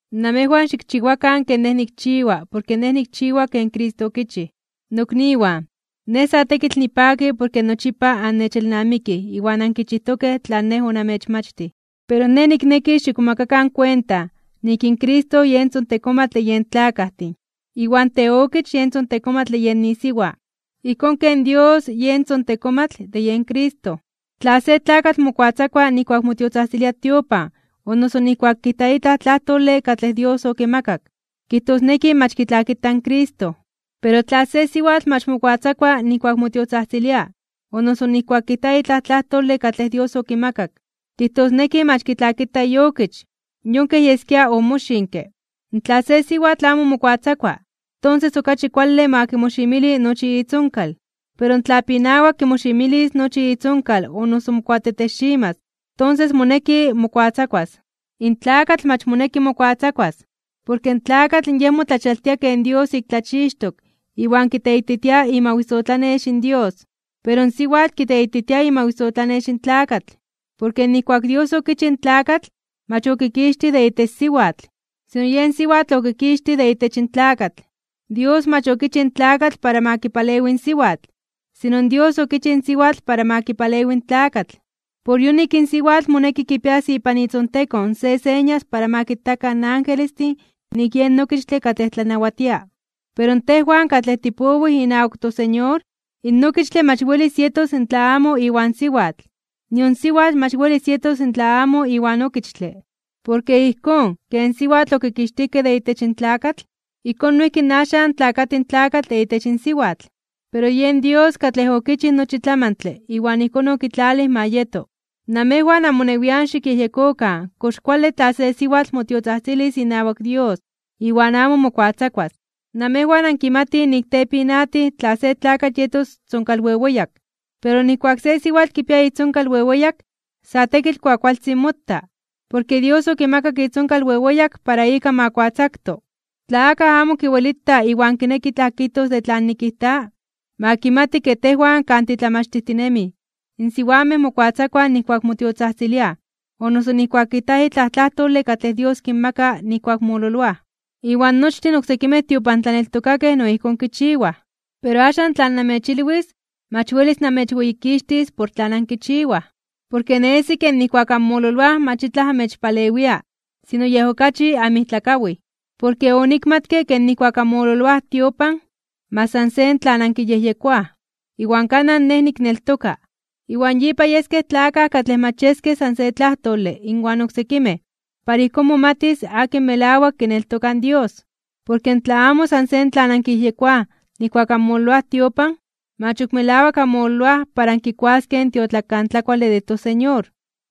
Namejwan xikchiwakan ken nej nikchiwa porke nej nikchiwa ken Cristo okichij. Nokniwan, sa tekitl nipaki porke nochipa annechelnamikij iwan ankichijtokej tlan nej onamechmachtij. Pero nej nikneki xikmomakakan kuenta nik in Cristo yen tzontekomatl de yen tlakajtin, iwan teokich yen tzontekomatl de yen isiwa, ijkón ken Dios yen tzontekomatl de yen Cristo. Tla se tlakatl mokuatzakua nijkuak motiotzajtzilia tiopan o noso nijkuak kijta itlaj tlajtole katlej Dios okimakak, kijtosneki mach kitlakita in Cristo. Pero tla se siwatl mach mokuatzakua nijkuak motiotzajtzilia o noso ijkuak kijta itlaj tlajtole katlej Dios okimakak, kijtosneki mach kitlakita iokich, yon kej yeskia omoxinke. Tla se siwatl amo mokuatzakua, tonses okachi kuale ma kimoximili nochi itzonkal. Pero tla pinawa kimoximilis nochi itzonkal o noso mokuatetexximas (mokuamelonximas), tonses moneki mokuatzakuas. In tlakatl mach moneki mokuatzakuas, porke in tlakatl yen motlachialtia ken Dios ik tlachixtok iwan kiteititia imawisotlanex in Dios. Pero in siwatl kiteititia imawisotlanex in tlakatl. Porke nijkuak in Dios okichij in tlakatl, mach okikixtij de itech siwatl, sino yen siwatl okikixtij de itech in tlakatl. Dios mach okichij in tlakatl para ma kipalewi in siwatl, sino in Dios okichij in siwatl para ma kipalewi in tlakatl. Por yonik in siwatl moneki kipias ipan itzontekon se señas para ma kitakan in angelestin nik yen okichtle katlej tlanawatia. Pero tejwan katlej tipowij inawak toSeñor, in okichtle mach welis yetos tla amo iwan siwatl, nion in siwatl mach welis yetos tla amo iwan okichtle. Porke ijkón ken siwatl okikixtijkej de itech in tlakatl, ijkón noijki axan in tlakatl tlakati de itech in siwatl. Pero yen Dios katlej okichij nochi tlamantle iwan ijkón okitlalij ma yeto. Namejwan amonewian xikyejyekokan kox kuale tla se siwatl motiotzajtzilis inawak Dios iwan amo mokuatzakuas. Namejwan ankimatij nik tepinatij tla se tlakatl yetos tzonkalweweyak. Pero nijkuak se siwatl kipia itzonkal weweyak, sa tekitl kuakualtzin mota, porke Dios okimakak itzonkal weweyak para ika ma kuatzakto. Tla akaj amo kiwelita iwan kineki itlaj kijtos de tlan nikijta, ma kimati ke tejwan kan titlamachtijtinemij, in siwamej mokuatzakuaj nijkuak motiotzajtziliaj o noso nijkuak kijtaj itlaj tlajtole katlej Dios kinmaka nijkuak mololoaj. Iwan nochtin oksekimej tiopantlaneltokakej no ijkón kichiwaj. Pero axan tlan namechilwis, mach welis namechweyikixtis por tlan ankichiwaj. Porke nesi kej nijkuak anmololoaj mach itlaj amechpalewia, sino yej okachi anmijtlakawij. Porke onikmatke ke nijkuak anmololoaj tiopan, mach san se tlan ankiyejyekoaj, iwan kanaj nej nikneltoka. Iwan yipa yeskej tlakaj katlej mach yeskej san se tlajtole inwan oksekimej para ijkón momatis akin melawak kineltoka in Dios. Porke tla amo san se tlan ankiyejyekoaj nijkuak anmololoaj tiopan, mach ok melawak anmololoaj para ankikuaskej in tiotlakantlakuale de toSeñor.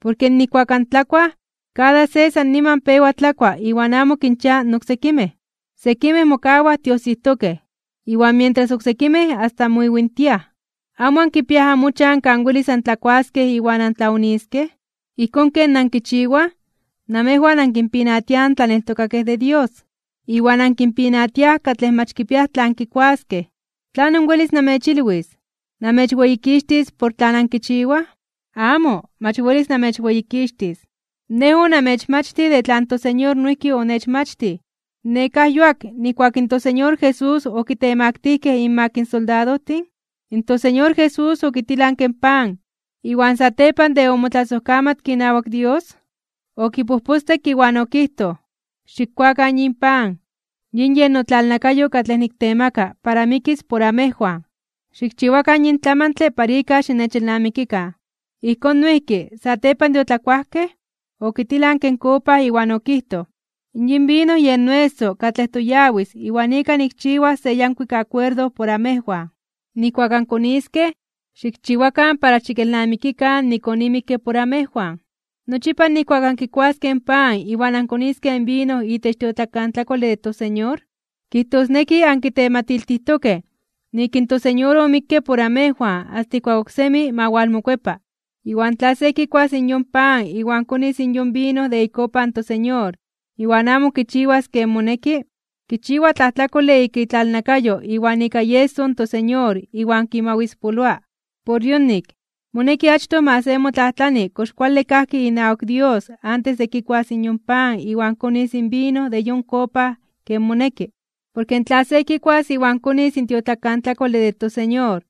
Porke nijkuak antlakuaj, kada se san niman pewa tlakua iwan amo ankinchiaj in oksekimej. Sekimej mokawaj tiosijtokej, iwan mientras oksekimej asta moiwintiaj. ¿Amo ankipiaj amochan kan welis antlakuaskej iwan antlaoniskej? Ijkón ken ankichiwaj, namejwan ankinpinatiaj in tlaneltokakej de Dios, iwan ankinpinatiaj katlej mach kipiaj tlan kikuaskej. ¿Tlanon welis namechilwis? ¿Namechweyikixtis por tlan ankichiwaj? ¡Amo! Mach welis namechweyikixtis. Nej onamechmachtij de tlan toSeñor noijki onechmachtij. Nekáj yuak nijkuak in toSeñor Jesús okitemaktijkej (okitemaktilijkej) inmak in soldadojtin, in toSeñor Jesús okitilanke in pan, iwan satepan de omotlasojkamatke inawak Dios, okipojpostekke iwan okijtoj: “Xikkuakan yin pan. Yin yen notlalnakayo katlej niktemaka para mikis por amejwan. Xikchiwakan yin tlamantle para ika xinechelnamikikan.” Ijkón noijki, satepan de otlakuajkej, okitilanke in kopa iwan okijtoj: “Yin vino yen noeso katlej toyawis iwan ika nikchiwas se yankuik akuerdo por amejwan. Nijkuak ankoniskej, xikchiwakan para xikelnamikikan nik onimikke por amejwan.” Nochipa nijkuak ankikuaskej in pan iwan ankoniskej in vino itech tiotlakantlakuale de toSeñor, kijtosneki ankitematiltijtokej nik in toSeñor omikke por amejwan asta ijkuak oksemi ma walmokuepa. Iwan tla se kikuas in yon pan iwan konis in yon vino de ikopa in toSeñor iwan amo kichiwas ken moneki, kichiwa tlajtlakole ika itlalnakayo iwan ika ieso in toSeñor iwan kimawispoloa. Por yonik, moneki achtoj ma se motlajtlani kox kuale kajki inawak Dios antes de kikuas yon pan iwan konis in vino de yon kopa ken moneki. Porke tla se kikuas iwan konis in tiotlakantlakuale de toSeñor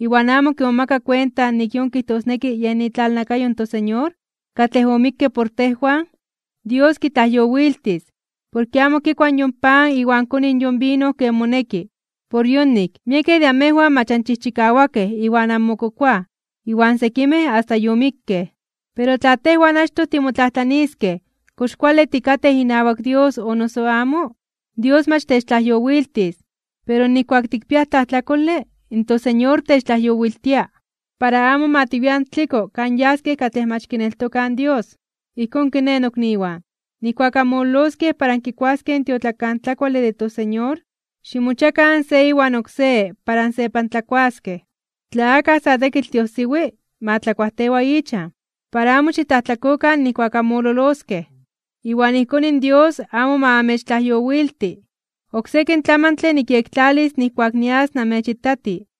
iwan amo kimomaka kuenta nik yon kijtosneki yen itlalnakayo in toSeñor katlej omikke por tejwan, Dios kitlajyowiltis, porke amo kikua yon pan iwan koni yon vino ken moneki. Por yonik, miekej de namejwan mach anchijchikawakej iwan anmokokoaj, iwan sekimej asta yomikkej. Pero tla tejwan achtoj timotlajtlaniskej kox kuale tikatej inawak Dios o noso amo, Dios mach techtlajyowiltis. Pero nijkuak tikpiaj tlajtlakole, in toSeñor techtlajyowiltia, para amo ma tiwian tliko kan yaskej katlej mach kineltokaj in Dios. Ijkón kiné, nokniwan, nijkuak anmololoskej para ankikuaskej in tiotlakantlakuale de toSeñor, ximochiakan se iwan oksé para ansepantlakuaskej. Tla akaj sa tekitl tiojsiwi, ma tlakuajtewa ichan, para amo xitlajtlakokan nijkuak anmololoskej, iwan ijkón Dios amo ma amechtlajyowilti. Oksekin tlamantle nikyektlalis nijkuak nias namechitati.